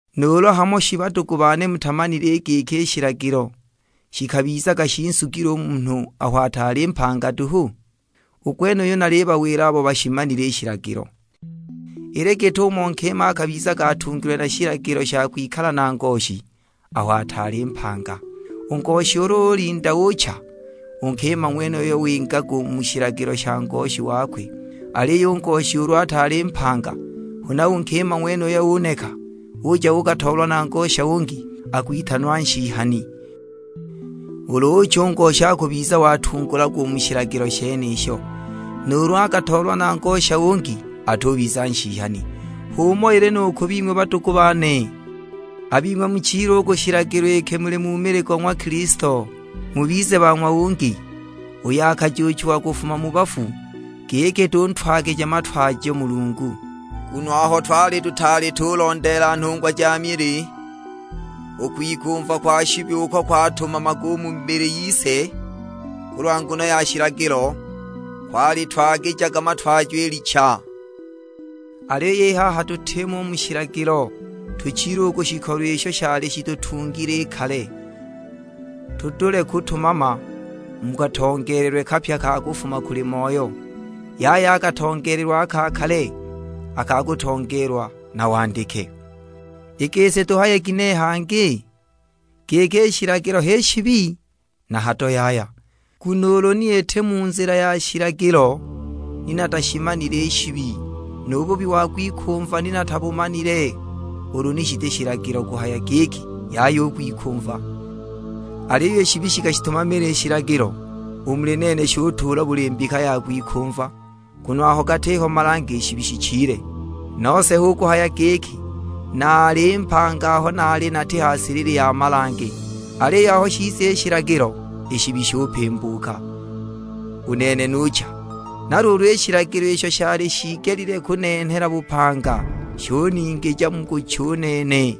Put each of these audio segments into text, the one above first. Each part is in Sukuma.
Nuulu hamo shi badugu bane mutamanile i giki i shilagilo shikabizaga shinsugile u munhu aho ataali mpanga duhu? U gwenuyu nalibawila abo bashimanile i shilagilo. Ili git'umo nkima akabizaga atungilwe na shilagilo sha kwikala na ngoshi aho ataali mpanga, u ngoshi ulu ulinda ucha, u nkima ng'wenuyo wingaga u mu shilagilo sha ngoshi wakwe. Aliyo u ngoshi ulu ataali mpanga huna u nkima ng'wenuyo uneka, uja uukatoolwa na ngosha ungi, akwitanwa nshihani; ulu ucha u ngoshi akubiza watungulagwa u mu shilagilo shenisho, nuulu akatoolwa na ngosha ungi atubiza nshihani. H'umo ili nu ku bing'we badugu bane; a bing'we muchile u ku shilagilo iki muli mu mili go ng'wa Kilisto, mubize ba ng'wa ungi, uyo akajuuchiwa kufuma mu bafu; giki tuntwagije matwajo Mulungu. Nguno aho twali tutaali tulondeela nhungwa ja mili, u kwikumva kwa shibi uko kwatumamaga u mu mibili yise kulwa nguno ya shilagilo, kwalitwagijaga matwajo i licha. Aliyo i haha tutimo u mu shilagilo, tuchile u ku shikolo isho shali shitutungile i kale, tudule kutumama mu katongeelelwe kapya ka kufuma kuli Moyo, yaya a katongeelelwe a ka kale, a ka kutongeelwa na wandike. I gisi tuhaye ginehe hangi? Giki i shilagilo h'i shibi? Na hado yaya! Nguno ulu ni iti mu nzila ya shilagilo ni natashimanile i shibi; nu bubi wa kwikumva ni natabumanile ulu ni shiti shilagilo kuhaya giki, "Yaya u kwikumva." Aliyo i shibi shikashitumamila i shilagilo, u muli nene shutuula buli mbika ya kwikumva; nguno ulu gatiho malange i shibi shichile. Nose hu kuhaya giki, naali mpanga aho naali nati ha silili ya malange; aliyo aho shiza shilagilo, i shibi shupimbuka, u nene nucha. Na luulu i shilagilo isho shali shiigelile kunenhela bupanga, shuningija mu kucha u nene.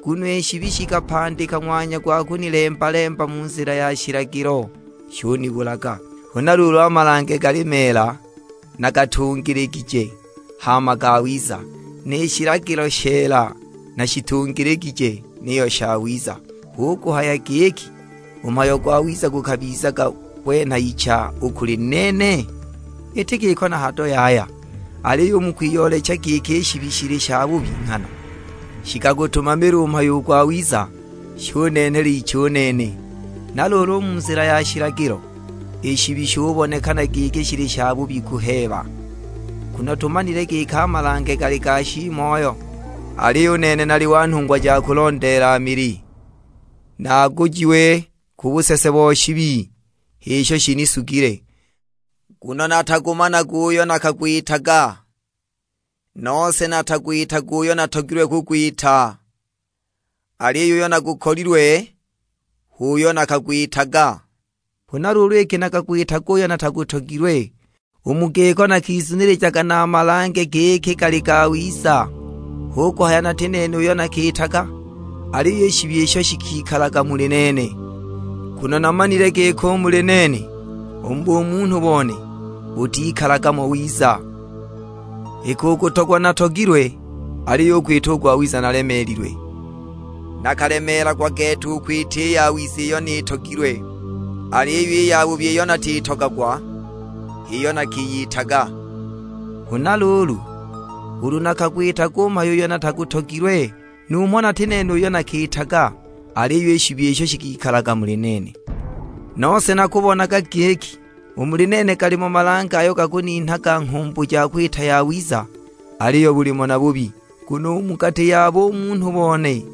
Nguno i shibi shikapandika ng'wanya gwa kunilemba-lemba mu nzila ya shilagilo, shunibulaga. Huna luulu a malange gali meela, na gatungiligije, hama gawiza; ni shilagilo sheela na shitungiligije, niyo shawiza. Hu kuhaya giki u mhayo gwawiza gukabiza gwenha icha u kuli nene? Iti giko na hado yaya, aliyo u mu kwiyoolecha giki i shibi shili shabubi nghana, shikagutumamila u mhayo u gwawiza, shunenhela icha u nene. Na luulu u mu nzila ya shilagilo, i shibi shubonekana giki shili shabubi kuheeba! Nguno tumanile giki a malange gali ga shiimoyo, aliyo u nene nali wa nhungwa ja kulondeela mili; nagujiwe ku busese bo shibi, h'isho shinisugile. Nguno natagumanaga uyo nakagwitaga, nose natagwitaga uyo natogilwe kugwita, aliyo uyo nagukolilwe h'uyo nakagwitaga. Huna luulu iki nakagwitaga uyo natagutogilwe, u mu giko nakizunilijaga na a malange, giki gali gawiza. Hu kuhaya nati nene uyo nakiitaga, aliyo i shibi isho shikikalaga muli nene! Nguno namanile giki u muli nene, u mu bumunhu bone, butikalaga mo wiza; iki u kutogwa natogilwe, aliyo u kwita u gwawiza nalemeelilwe. Nakalemeelagwa gete u kwita i yawiza iyo nitogilwe, aliyo i yabubi iyo natitogagwa h'iyo nakiyitaga! Huna luulu, ulu nakagwitaga u mhayo uyo natagutogilwe, numho nati nene uyo nakiitaga; aliyo i shibi isho shikikalaga u muli nene. Nose nakubonaga giki, u muli nene galimo malange ayo gakuninhaga nghumbu ja kwita yawiza, aliyo bulimo na bubi. Nguno u mu gati ya bumunhu bone,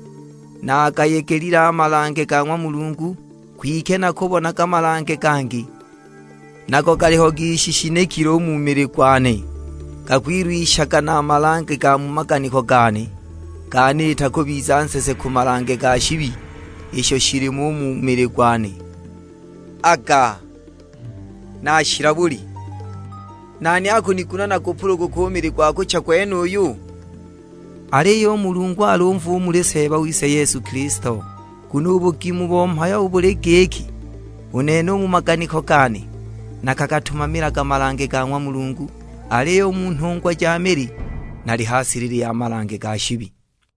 nagayegelile a malange ga ng'wa Mulungu. Kwike nakubonaga Malange gangi, nago galiho gishishinikile u mu mili gwane nuulu: mabudika ga mili gwane.', gakwilwishaga na a malange ga mu maganiko gane, ganiita kubiza nsese ku malange ga shibi isho shilimo u mu mili gwane Aga, nashila buli! Nani akuniguna nagupuluguke u mili gwa kucha gwenuyu? Aliyo u Mulungu alumve u muli Seeba wise Yesu Kilisto. Nguno u bugima bo mhayo buli giki, u nene u mu maganiko gane, nakagatumamilaga malange ga ng'wa Mulungu. Aliyo u mu nhungwa ja mili, nali ha silili ya malange ga shibi!